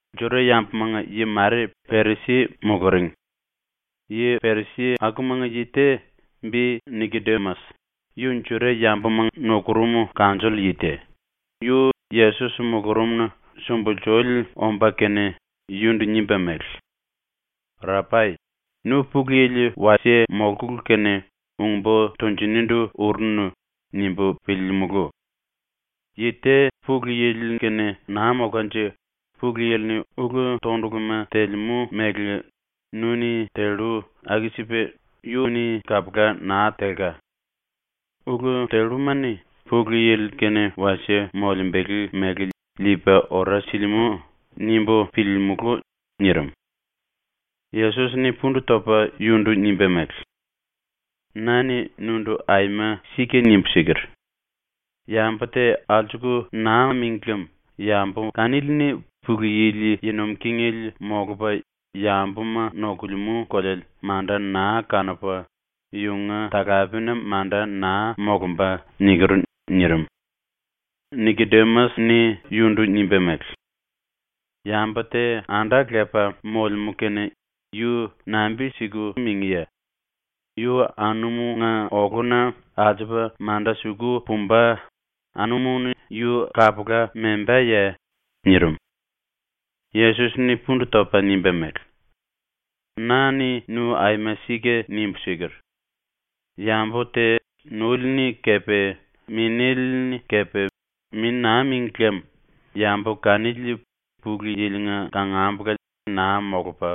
⸤Juda-yambumanga yi mare Perisi muluring.⸥ Yi-Perisi akumanga yi te, bi ‘Nikodimas’, yu Juda-yambuma nukurum kanjoll yi te, yu Yesos mulurumna sumbulsuli omba kene, yundu nimba mele: “Rapai, ‘Nu Pulu Yili wasie molkulu kene ung-bo tunjunindu urunu.’ nimbu piliilimulu. Yi te ‘Pulu Yili-kene naa molkanje Pulu Yili-ni ulu-tonduluma telemú mele nu-ni tellu aku-sipa yu-ni kapula naa telka. Ulu telluma-ni Pulu Yili-kene wasie molembele mele liipa ora silimú.’ nimbu piliilimulu.” nirim. Yesos-ni pundu topa yundu nimba mele: “Na-ni nundu aima sika nimbu siker: “Yambu te alsuku naa míngi lem yambu kanili-ni Pulu Yili yi nuim kingele molupa yambuma nokulemú koleale manda naa kanupa yunga talapena manda naa molumba.” niker.” nirim. Nikodimas-ni yundu nimba mele: “Yambu te anda lepa molemú kene yu nambi-siku mingíye? Yu anumunga oluna alsupa manda suku pumba, anumu-ni yu kapula membaye?” nirim. Yesos-ni pundu topa nimba mele: “Na-ni nu aima sika nimbu siker: ‘Yambu te nole-ni kepe Minéle-ni kepe mi naa míngli lem yambu kanili Pulu Yili-nga kangambula naa molupa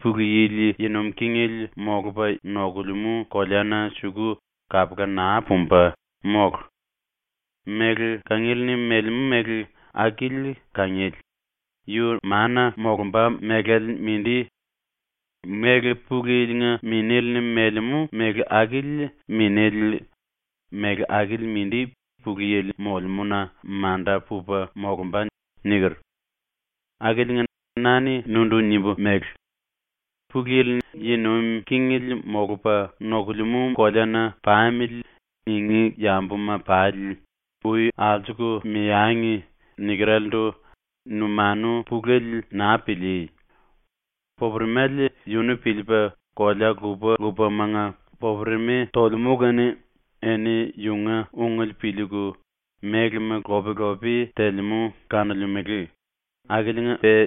Pulu Yili yi nuim kingele molupa nokulemú koleana suku kapula naa pumba, mólu. Méle kangiele-ni melemú méle akili kangiele, yu mana molumba mélale mindi. Méle Pulu Yili-nga Minéle-ni melemú méle akili minéle, méle akili mindi Pulu Yili molemúna manda pupa molumba.’ niker. “Akiliinga na-ni nundu nimbu mele: “‘Pulu Yili yi nuim kingele molupa nokulemú koleana pamili.’ ningí yambuma pali ui alsuku meangi.” nikerelendu numanu pulele naa pilíí. Popuremale yunu piliipa kolea lupa-lupamanga popuremi tolemú kene eni yunga ungele piliiku, mélema lop-lopi telemú kanolemele, akiliinga-pe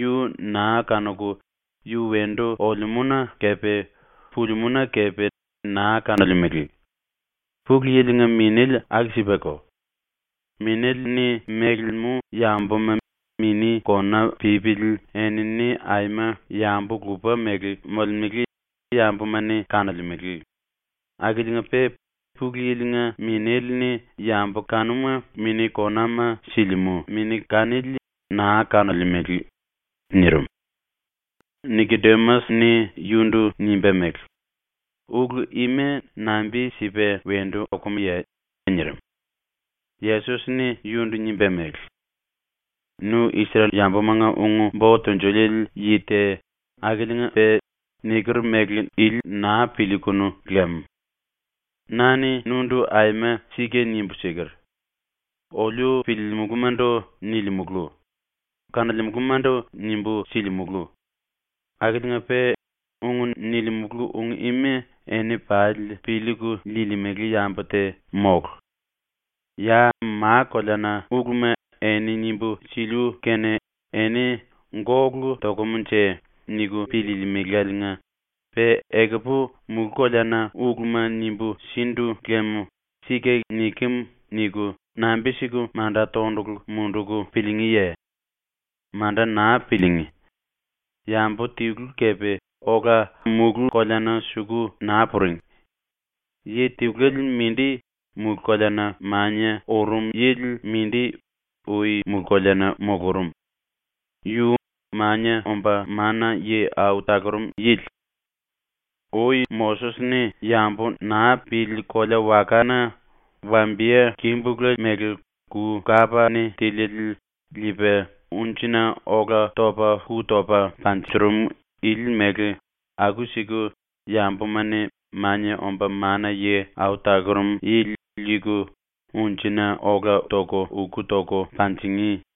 yu naa kanuku yu wendu olemúna kepe pulimúna kepe naa kanolemele. Pulu Yili-nga Minéle aku-sipako. Minéle-ni melemú yambuma mini kona pípili enini aima yambu lupa mele molemele yambuma-ni kanolemele, akiliinga-pe ⸤Pulu Yili-nga⸥ Minéle-ni yambu kanuma mini konama silimú Mini kanili naa kanolemele.” nirim. Nikodimas-ni yundu nimba mele: “Ulu ima nambi-sipa wendu okumuye?” nirim. Yesos-ni yundu nimba mele: “Nu Isrel-yambumanga ung-bo tunjuliele yi te akiliinga-pe i niker mele naa piliikunu lam. Na-ni nundu aima sika nimbu siker: Oliu piliilimulumandu nilimulu; kanolemulumandu nimbu silimulu. Akiliinga-pe ung nilimulu ung ima eni pali piliiku liilimele yambu te mólu. Ya ma-koleana uluma eni nimbu siliu kene eni ‘Gólu tokumnje.’ niku piliilimiláliinga pe ekupu mulú-koleana uluma nimbu sindu lem ‘Sika nikem.’ niku nambi-siku manda tondulu munduku piliingíye? Manda naa piliingí. Yambu tilu kepe ola mulú-koleana suku naa puring. Yi tiluele mindi, mulú-koleana mania urum yili mindi ui mulú-koleana mulurum. Yu Mania Omba Mana-Yi Au Talurum Yili. “Ui Moses-ni yambu naa pili kolea-wakana wambiye-kimbulu mele ku-kapa-ni tiliele liipa ⸤unjina-⸥ola ⸤topa⸥ ku topa munjurum ili mele aku-siku yambuma-ni Mania Omba Mana-Yi Au Talurum Yili liiku ⸤unjina-⸥ ola ⸤toku⸥ ku toku panjingí.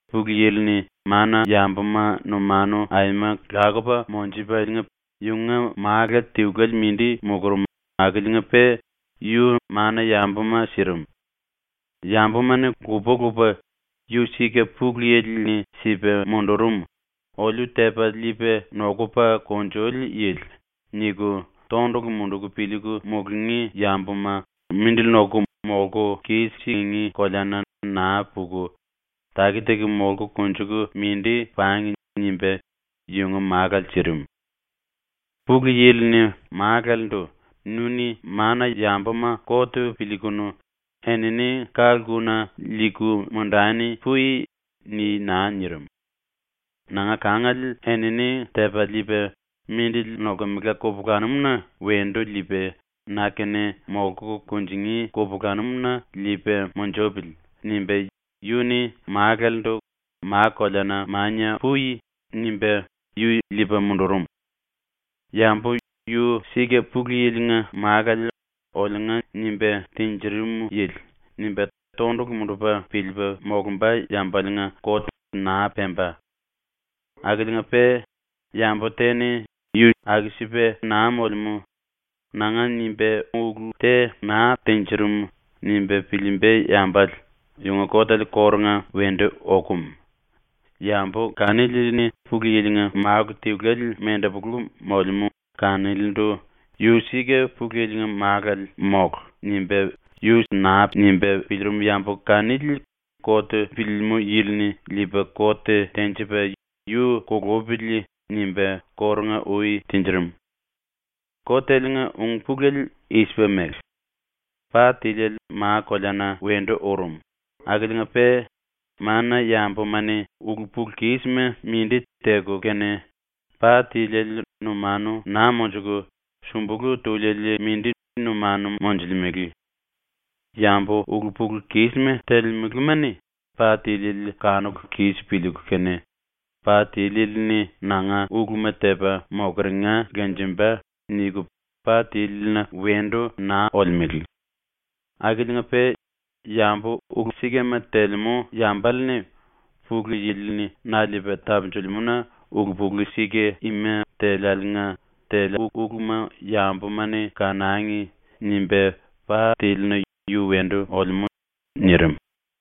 “Pulu Yili-ni mana-yambuma numanu aima lakupa monjupaliinga yunga Málu tiluele mindi mulurum akiliinga-pe yu ⸤mana-yambuma⸥ sirim. ‘Yambuma-ni lupa-lupa ‘Yu sika ⸤Pulu Yili-ni sipa mundurum, oliu tepa liipa nokupa kunjuli yili.⸥’ niku tondulu munduku piliiku mulungí yambuma mindili noku molku kis-singí koleana naa puku, taki-taki molku konjuku mindi pangi.’ nimba yunga Málale sirim. “Pulu Yili-ni Málalendu “Nu-ni mana-yambuma kot piliikunu enini ka-lkuna liiku mundani pui.” ni naa nirim. ‘Nanga kangale enini tepa liipa mindili nolkemela kupulanum-na wendu liipa na-kene molku kunjingí kupulanum-na liipa munjupili.’ nimba yu-ni Málalendu “Ma-koleana mania pui.” nimba yu liipa mundurum. Yambu ‘Yu sika ⸤Pulu Yili-nga Málale, oliunga nimba tinjirim yili⸥.’ nimba tondulu mundupa piliipa molumba yambaliinga kot naa pemba. Akiliinga-pe yambu te-ni ‘Yu aku-sipa naa molemú. Nanga nimba ulu te naa tinjirim.’ nimba piliimba yambale, yunga kotele kórunga wendu okum. Yambu kanili-ni Pulu Yili-nga Málu tiluele mendepolu molemú kanilindu ‘Yu sika Pulu Yili-nga Málale mólu.’ nimba piliirim yambu kanili kot piliilimú yili-ni liipa kot tenjipa “Yu kulupili.” nimba kórunga-ui tinjirim. “Koteliinga ung-pulele i-sipa mele: Pa tíliele ma-koleana wendu urum akiliinga-pe mana-yambuma-ni ulu-pulu-kísima mindi teku kene pa tiliele numanu naa monjuku súmbulu tuliele mindi numanu monjulemele. Yambu ulu-pulu-kísima telemelema-ni pa tiliele kanuku kis piliiku kene, ‘Pa tíliele-ni nanga uluma tepa mokeringa lenjemba.’ niku pa tílina wendu naa olemele. Akiliinga-pe yambu ulu-sikama telemú yambale-ni ‘Pulu Yili-ni na liipa tapunjilimú-na ulu-pulu sika ima teliáliinga teliu uluma yambuma-ni kanangi.’ nimba pa tílina yu wendu olemú.” nirim.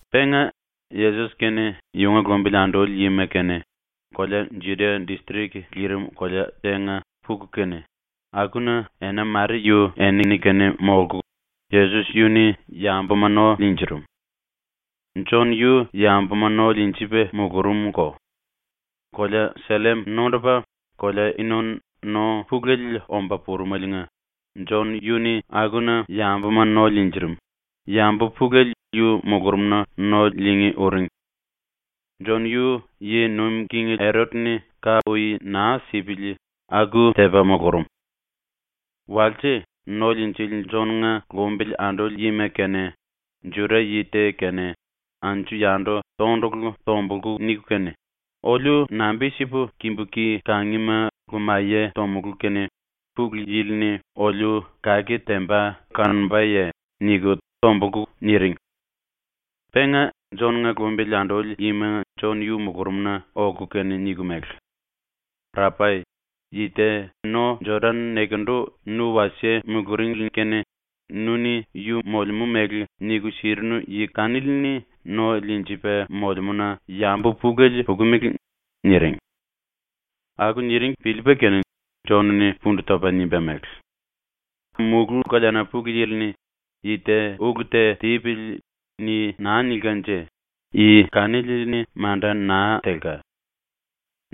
Penga Yesos kene yunga lumbili anduli yima kene kolea Judia distrik lirim kolea tenga puku kene, akuna ena mare yu enini-kene molku, ⸤Yesos⸥ yu-ni yambuma no liinjirim. Jon yu yambuma no liinjipa mulurumko. Kolea Sellim nondupa kolea Inon no pulele omba purumeliinga Jon yu-ni akuna yambuma no liinjirim, yambu pulele yu mulurumna no liingí uring. (Jon yu ⸤yi nuim king Erot-ni⸥ ka ui naa sipili aku tepa mulurum.) Walse ⸤No Liinjili⸥ Jon-nga lumbili anduli yima kene Juda-yi te kene anju-yandu tondulu tombulku niku kene, “Oliu nambi-sipu kimbu ki kangima lumaye tomulú kene Pulu Yili-ni oliu kake temba kanombaye?” niku tombulku niring. Penga Jon-nga lumbili anduli yima Jon yu mulurumna oku kene niku mele: “Rapai, yi te no Jodan nekendu nu wasie muluringli kene nu-ni yu molemú mele niku sirinu yi kanili-ni no liinjipa molemúna yambu pulele pukumele.” niring. Aku niring piliipa kene Jon-ni pundu topa nimba mele: “Mulú-koleana Pulu Yili-ni ‘Yi te ulu te tipili.’ ni naa nilkanje yi kanili-ni manda naa telka.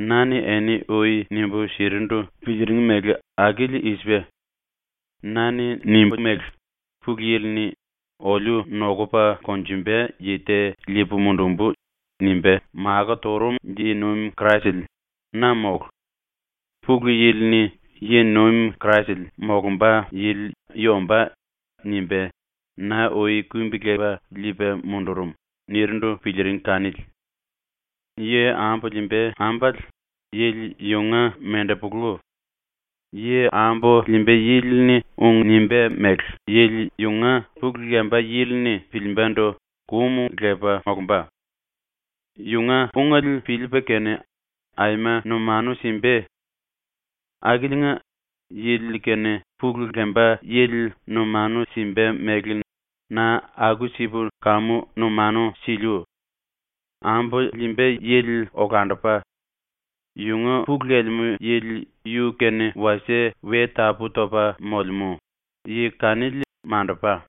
Na-ni eni ui nimbu sirindu piliiring mele akili i-sipa: Na-ni nimbu mele: “Pulu Yili-ni ‘Oliu nokupa konjumba yi te liipu mundumbu.’ nimba makó turum yi-nuim Kraisele na mólu. Pulu Yili-ni ‘Yi-nuim Kraisele molumba yili yu ombá.’ nimba na ui kumbi-lepa liipa mundurum.” nirindu piliiring kanili. Yi ambu liimba ambale yili yunga mendepolu. Yi ambu liimba yili-ni ung nimbá mele yili yunga pulu lemba yili-ni piliimbandu kum lepa molumba. Yunga ungele piliipa kene aima numanu simba. Akiliinga, yili kene pulu lemba yili numanu simba mele na aku-sipu kamu numanu siliu. Ambu liimba yili olandupa. Yunga pulu lelemú yili yu-kene wasie we tapú-topa molemú, yi kanili mandupa.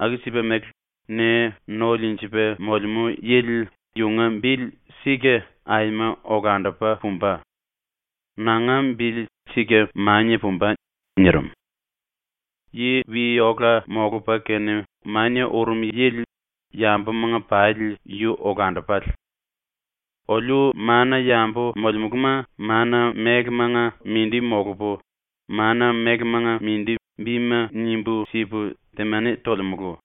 Aku-sipa mele ne no liinjipa molemú yili yunga bili sika aima olandupa pumba. Nanga bili sika mania pumba.” nirim. Yi wi-ola molupa kene mania urum yili yambumanga pali yu olandupale. Oliu mana-yambu molemuluma mana-mélemanga mindi molupu, mana-mélemanga mindi bima nimbu sipu temani tolemulu.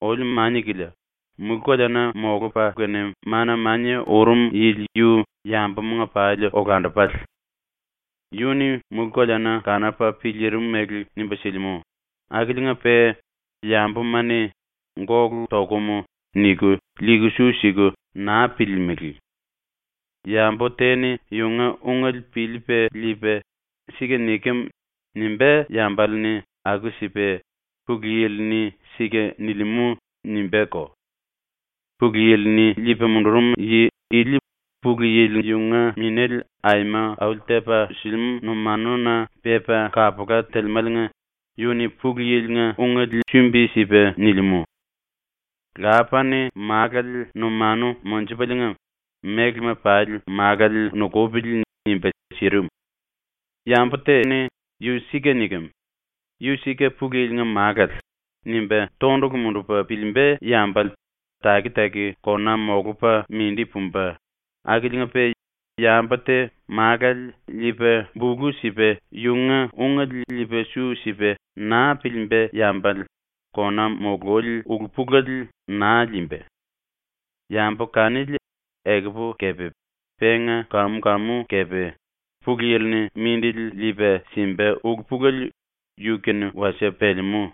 Oliu mania-kilia, mulú-koleana molupa kene mana-mania urum yili yu yambumanga pali olandupale. Yu-ni mulú-koleana kanupa piliirim mele nimba silimú akiliinga-pe yambuma-ni “Gólu tokum.” niku liiku su siku naa piliilimili. Yambu te-ni yunga ungele piliipa liipa “Sika nikem.” nimbá yambale-ni aku-sipa “Pulu Yili-ni sika nilimú.” nimbáko. Pulu Yili-ni liipa mundurum yi ili Pulu Yili yunga Minéle aima auli-tepa silimú numanuna pepa kapula telemáliinga yu-ni Pulu Yili-nga ungele sumbi-sipa nilimú. Lapa-ni Málale numanu monjupaliinga ‘Mélema pali Málale nukupili.’ nimba sirim. Yambu te ‘⸤Yu sika nikem.⸥ Yu sika Pulu Yili-nga Málale.’ nimba tondulu mundupa piliimba yambale taki-taki kona molupa mindi pumba, akiliinga-pe yambu te Málale liipa bulu sipa yunga ungele liipa su sipa naa piliimba yambale kona mululi ulu-pulele naa liimba. Yambu kanili ekupu kepe penga kam-kamu kepe Pulu Yili-ni mindili liipa simba ulu-pulele yu-kene wasie pelemú.